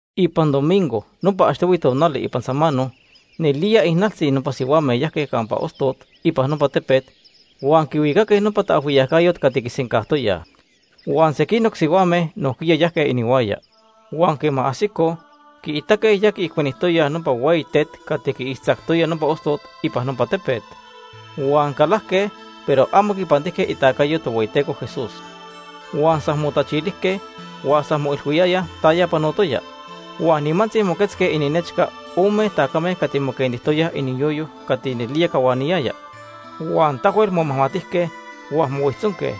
Ipan domingo, nopa achtohui tonali ipan samano, nelía ijnaltzi nopa sihuame yajque campa ostot ipan nopa tepet huan quihuicaque nopa taajhuiyacayot cati quisencajtoyaj. Huan sequinoc sihuame nojquiya yajque inihuaya. Huan quema ajsicoj, quiitaque ya quiijcuenijtoyaj nopa hueyi tet cati quiixtzactoya nopa ostot ipan nopa tepet. Huan calajque, pero amo quipantijque itacayo Tohueyiteco Jesús. Huan san motachilijque huan san moilhuiyayaj taya panotoya. Huan nimantzi moquetzque ininechca ome tacame cati moquentijtoyaj iniyoyo cati nelía cahuaniyaya. Huan tahuel momajmatijque huan mohuijtzonque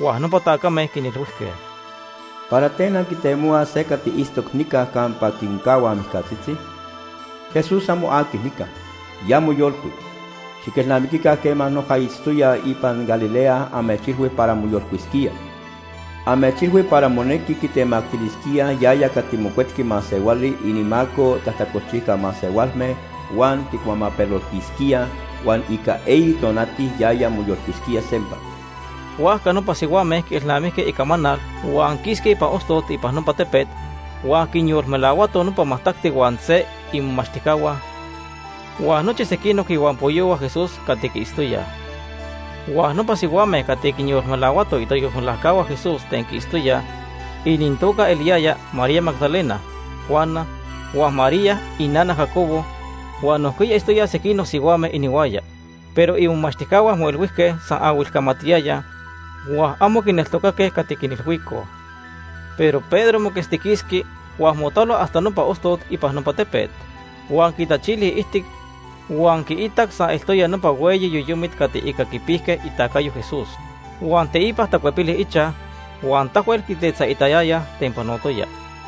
huan nopa tacame quinilhuijque: ―¿Para ten anquitemohuaj se cati itztoc nica campa quincahuaj mijcatzitzi? Jesús amo aqui nica. Ya moyolcuic. Xiquelnamiquica quema noja itztoya ipan Galilea amechilhui para moyolcuisquía. Amechilhui para monequi quitemactilisquíaj yaya cati Mocuetqui Masehuali inimaco tajtacolchijca masehualme huan quicuamapeloltisquíaj huan ica eyi tonati yaya moyolcuisquía sempa. Huajca nopa sihuame quielnamijque icamanal, huan quisque ipan ostot ipan nopa tepet huan quinyolmelahuatoj nopa majtacti huan se imomachtijcahua huan nochi sequinoc ihuampoyohua Jesús cati quiitztoyaj. Huan nopa sihuame cati quinyolmelahuatoj itayolmelajcahua Jesús ten quiitztoyaj inintoca eliyaya María Magdalena, Juana, huan María inana Jacobo huan nojquiya itztoyaj sequinoc sihuame inihuaya. Pero imomachtijcahua moilhuijque san ahuilcamanaltiyayaj huan amo quineltocaque cati quinilhuicoj. Pero Pedro moquetztiquisqui huan motalo hasta nopa ostot ipan nopa tepet. Huan quitachili iijtic huan quiitac san eltoya nopa hueyi yoyomit cati ica quipijque itacayo Jesús. Huan teipa tacuepili ichaj huan tahuel quitetzaitayaya ten panotoya.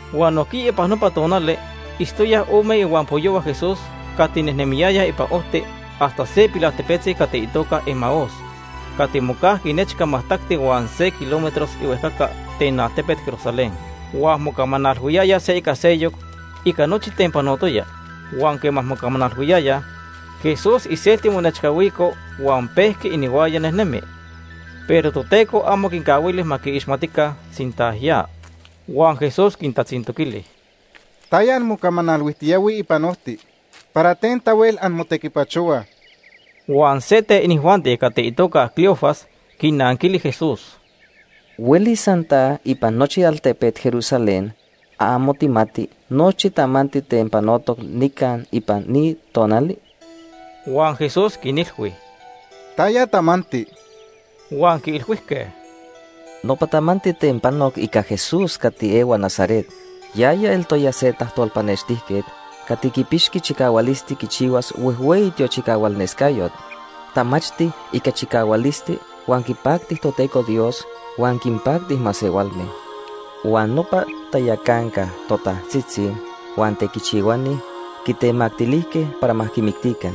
Huan nojquiya ipan nopa tonali itztoyaj ome ihuampoyohua Jesús cati nejnemiyayaj ipan ojti hasta se pilaltepetzi cati itoca Emaús cati mocajqui nechca majtacti huan se kilómetros ihuejcaca ten altepet Jerusalén. Huan mocamanalhuiyayaj se ica seyoc ica nochi ten panotoya. Huan quema mocamanalhuiyayaj, Jesús iselti monechcahuico huan pejqui inihuaya nejnemi. Pero Toteco amo quincahuili ma quiixmatica sinta ya. Huan Jesús quintatzintoquili: ―¿Taya anmocamanalhuijtiyahuij ipan ojti? ¿Para ten tahuel anmotequipachohuaj? Huan se ten inijuanti cati itoca Cleofas quinanquili Jesús: ―¿Huelis san ta ipan nochi altepet Jerusalén amo tijmati nochi tamanti ten panotoc nica ipan ni tonali? Huan Jesús quinilhui: ―¿Taya tamanti? Huan quiilhuijque: ―Nopa tamanti ten panoc ica Jesús cati ehua Nazaret. Yaya eltoya se tajtolpanextijquet cati quipixqui chicahualisti quichihuas huejhueyi tiochicahualnescayot. Tamachti ica chicahualisti huan quipacti Toteco Dios huan quinpacti masehualme. Huan nopa tayacanca totajtzitzi huan tequichihuani quitemactilijque para ma quimictica.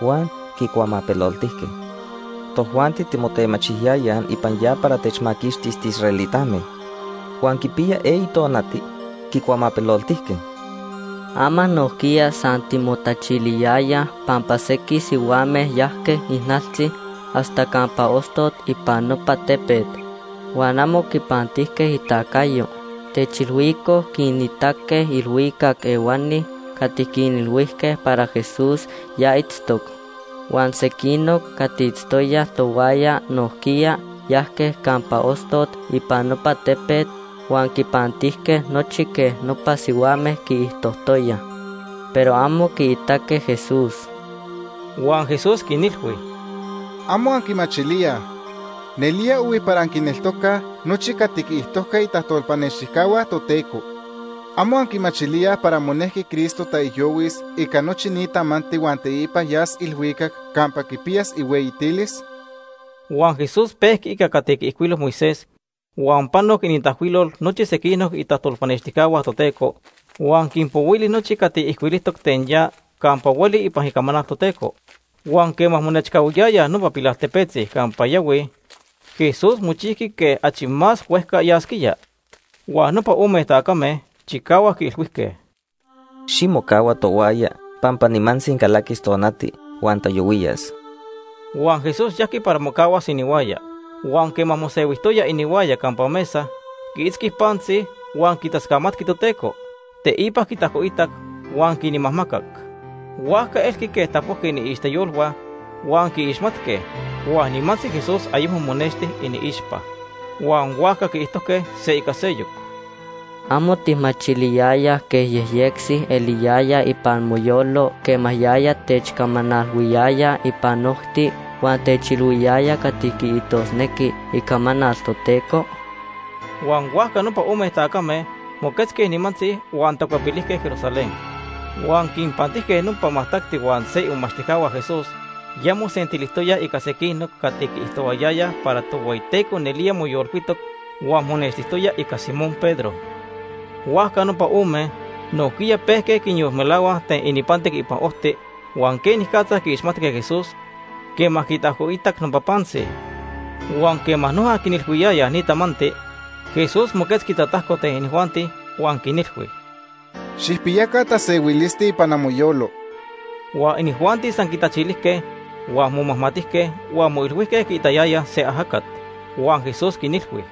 Huan quicuamapeloltijque. Tojuanti timotemachiyayaj ipan ya para techmaquixtis tiisraelitame. Huan quipiya eyi tonati quicuamapeloltijque. Ama nojquiya san timotachiliyayaj pampa sequij sihuame yajque ijnaltzi hasta campa ostot ipan nopa tepet, huan amo quipantijque itacayo. Techilhuicoj quinitaque ilhuicac ehuani cati quinilhuijque para Jesús ya itztoc. Huan sequinoc cati itztoyaj tohuaya nojquiya yajque campa ostot ipan nopa tepet huan quipantijque nochi quej nopa sihuame quiijtojtoyaj, pero amo quiitaque Jesús. Huan Jesús quinilhui: ―¿Amo anquimachilíaj? Nelía ohui para anquineltocaj nochi cati quiijtojque itajtolpanextijcahua Toteco. ¿Amo anquimachilíaj para monejqui Cristo taijyohuis ica nochi ni tamanti huan teipa yas ilhuicac campa quipiyas ihueyitilis? Huan Jesús pejqui ica cati quiijcuilo Moisés huan panoc inintajcuilol nochi sequinoc itajtolpanextijcahua Toteco, huan quinpohuili nochi cati ijcuilijtoc ten ya campa hueli ipan Icamanal Toteco. Huan quema monechcahuiyayaj nopa pilaltepetzi campa yahuij, Jesús mochijqui quej achi más huejca yasquía. Huan nopa ome tacame chicahuac quiilhuijque: ―Ximocahua tohuaya pampa nimantzi calaquis tonati huan tayohuiyas. Huan Jesús yajqui para mocahuas inihuaya. Huan quema mosehuijtoya inihuaya campa mesa, quiitzqui pantzi huan quitascamatqui Toteco, teipa quitajcoitac huan quinmajmacac. Huajca elqui quej tapojqui iniixteyolhua huan quiixmatque, huan nimantzi Jesús ayecmo monexti iniixpa. Huan huajca quiijtojque se ica seyoc: ―¿Amo tijmachiliyaya quej yejyectzi eliyaya ipan moyolo quema yaya techcamanalhuiyaya ipan ojti huan techilhuiyaya cati quiijtosnequi Icamanal Toteco? Huan huajca nopa ome tacame moquetzque nimantzi huan tacuepilijque Jerusalén. Huan quinpantijque nopa majtacti huan se imomachtijcahua Jesús ya mosentilijtoyaj ica sequinoc cati quiijtohuayayaj para Tohueyiteco nelía moyolcuitoc huan monextijtoya ica Simón Pedro. Huajca nopa ome nojquiya pejque quinyolmelahuaj ten ininpantic ipan ojti huan quenicatza quiixmatque Jesús quema quitajcoitac nopa pantzi. Huan quema noja quinilhuiyayaj ni tamanti, Jesús moquetzqui tatajco ten inijuanti huan quinilhui: ―Xijpiyaca tasehuilisti ipan amoyolo. Huan inijuanti san quitachilijque huan momajmatijque huan moilhuijque quiitayayaj se ajacat. Huan Jesús quinilhui: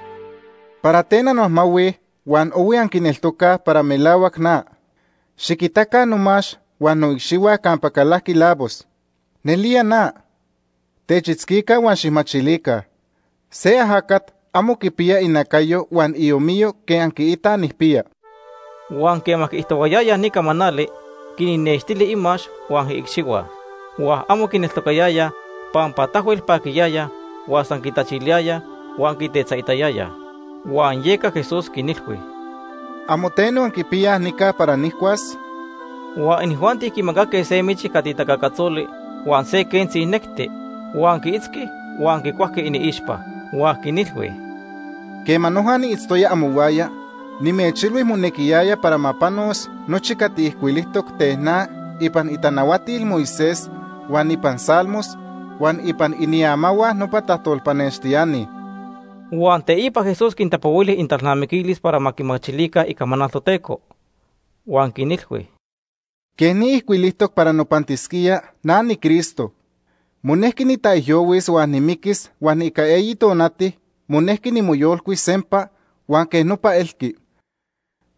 ―¿Para ten anmajmahuij huan ohui anquineltocaj para melahuac na? Xiquitaca nomax huan noicxihua campa calajqui lavos. Nelía na. Techitzquica huan xijmachilica. Se ajacat amo quipiya inacayo huan iomiyo quej anquiitaj nijpiya. Huan quema quiijtohuayaya ni camanali, quinnextili imax huan iicxihua. Huan amo quineltocayayaj pampa tahuel paquiyayaj huan san quitachiliyayaj huan quitetzaitayayaj. Huan yeca Jesús quinilhui: ―¿Amo teno anquipiyaj nica para nijcuas? Huan inijuanti quimacaque se michi cati tacacatzoli huan se quentzi necti. Huan quiitzqui huan quicuajqui iniixpa. Huan quinilhui: ―Quema noja niitztoya amohuaya, nimechilhui monequiyaya para ma panos nochi cati ijcuilijtoc ten na ipan itanahuatil Moisés, huan ipan Salmos, huan ipan iniamahua nopa tajtolpanextiani. Huan teipa Jesús quintapohuili inintalnamiquilis para ma quimachilica Icamanal Toteco. Huan quinilhui: ―Quej ni ijcuilijtoc para nopantisquía na niCristo. Monejqui nitaijyohuis huan nimiquis huan ica eyi tonati monejqui nimoyolcuis sempa, huan quej nopa elqui.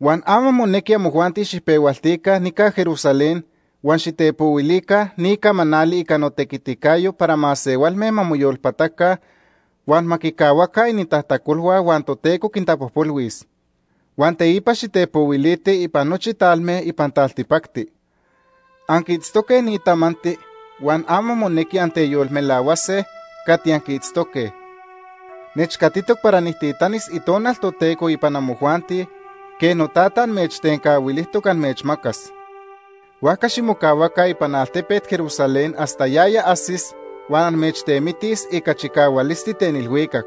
Huan ama monequi amojuanti xijpehualtica nica Jerusalén huan xitepohuilica ni camanali ica notequiticayo. para masehualme ma moyolpataca huan ma quicahuaca inintajtacolhua huan Toteco quintapojpolhuis. Huan teipa xitepohuilitij ipan nochi talme ipan taltipacti. Anquiitztoque ni tamanti huan ama monequi anteyolmelahuase cati anquiitztoque. Nechcatitoc para nijtitanis Itonal Toteco ipan amojuanti quej noTata amechtencahuilijtoc amechmacas. Huajca ximocahuaca ipan altepet Jerusalén hasta yaya ajsis huan amechtemitis ica chicahualisti ten ilhuicac.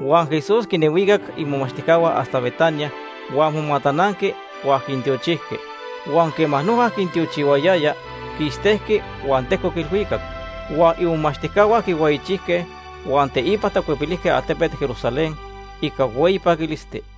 Huan Jesús quinhuicac imomachtijcahua hasta Betania huan momatananqui huan quintiochijqui. Huan quema noja quintiochihuayaya, quistejqui huan tejcoc ilhuicac. Huan imomachtijcahua quihueyichijque huan teipa tacuepilijque altepet Jerusalén ica hueyi paquilisti.